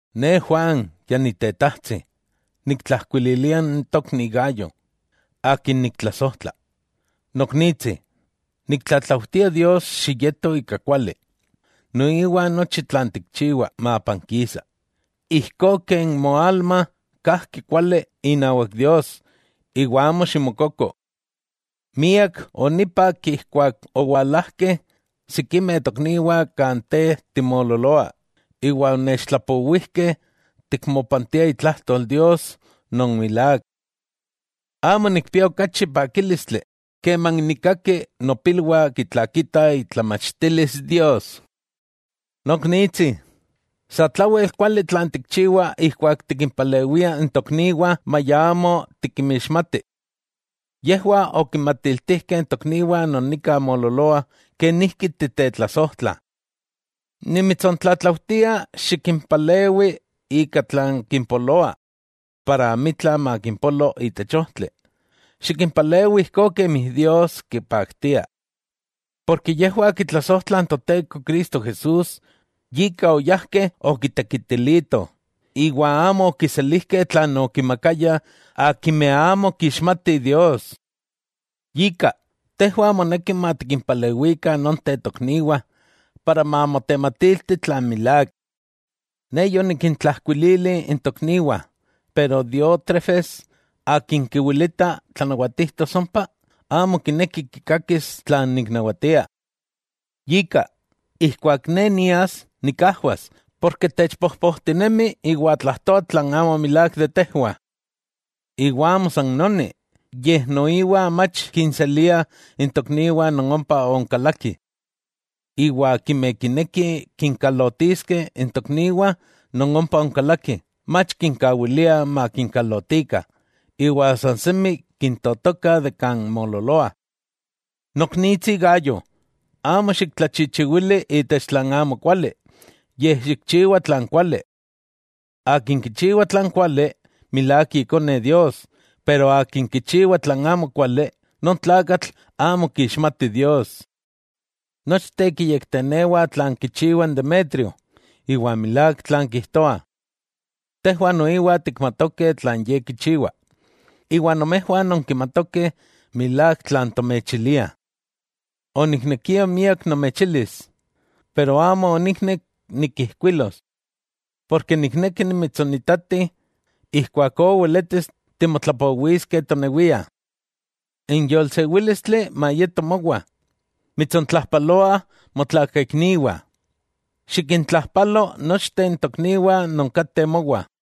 Ne Juan ya ni tetajtsi, niktlajkuililia n tokni Gayo, akin niktlasojtla. Noknitsi, niktlatlautia Dios xiyeto ika kuali, noiwa nochi tlan tikchiwa mapankisa, ijkó ken moalma kajki kuali inawak Dios iwa amo ximokoko. Miak onipak ijkuak owalajkeh sikimeh tokniwah kan te timoololoa, iwa onechtlapowijkeh tikmopantia itlajtol Dios non milák. Amo nikpia okachi pakílistli, keman nikkaki nopilwah kitlakitah itlamachtilis Dios. Noknitsi, satlawel kuali tlan tikchiwa ijkuak tikimpalewia n tokniwah maya amo tikinmixmati. Yejwah okinmatiltijkeh n tokniwah non nika moololoah kenijki titetlasojtla. Nimitsontlatlaujtia, xikimpalewi ika tlan kimpoloa, para amitla makimpolo itech ojtli, xikinpalewi ijkó kemi Dios kipaktia. Porke yejwah kitlasojtlah n Toteko Cristo Jesús, yika oyajkeh okitekitilitoh, iwa amo okiselijkeh tlan okinmakayah akimeh amo kixmatih Dios. Yika, tejwah moneki matikimpalewikah nonteh tokniwah, para mamotematilti tlan milák. Ne yonikintlajkuilili n tokniwah, pero Diótrefes akin kiwilita tlanawatijtos ompa, amo kineki kikakis tlan niknawatia. Yika, ijkuak ne nias nikajwas, porke techpojpojtinemi iwa tlajtoa tlan amo milák de tejwah. Iwa amo san noni, yej noiwa mach kinselia n tokniwah non ompa onkalakih. Iwa akimeh kinekih kinkalotiskeh n tokniwah non ompa onkalakih, mach kinkawilia makinkalotikah iwa san semi kintotoka de kan moololoa. Noknitsi Gayo, amo xiktlachichiwili itech tlan amokuali, yej xikchiwa tlan kuali. Akin kichiwa tlan kuali, milák ikone Dios, pero akin kichiwa tlan amokuali, non tlakatl amo kixmati Dios. Nochteh kiyektenewah tlan kichiwa n Demetrio, iwa milák tlan kijtoah. Tejwah noiwa tikmatokeh tlan ye kichiwa, iwa nomejwah nonkimatokeh milák tlan tomechiliah. Oniknekia miak nomechilis, pero amo oniknek nikijkuilos, porke nikneki nimitsonitati, ijkuakó weletis timotlapowiskeh tonewia. N yolsewílistli mayeto mowa. Mitsontlajpaloah motlakaikniwah. Xikintlajpalo nochteh n tokniwah non kateh mowa.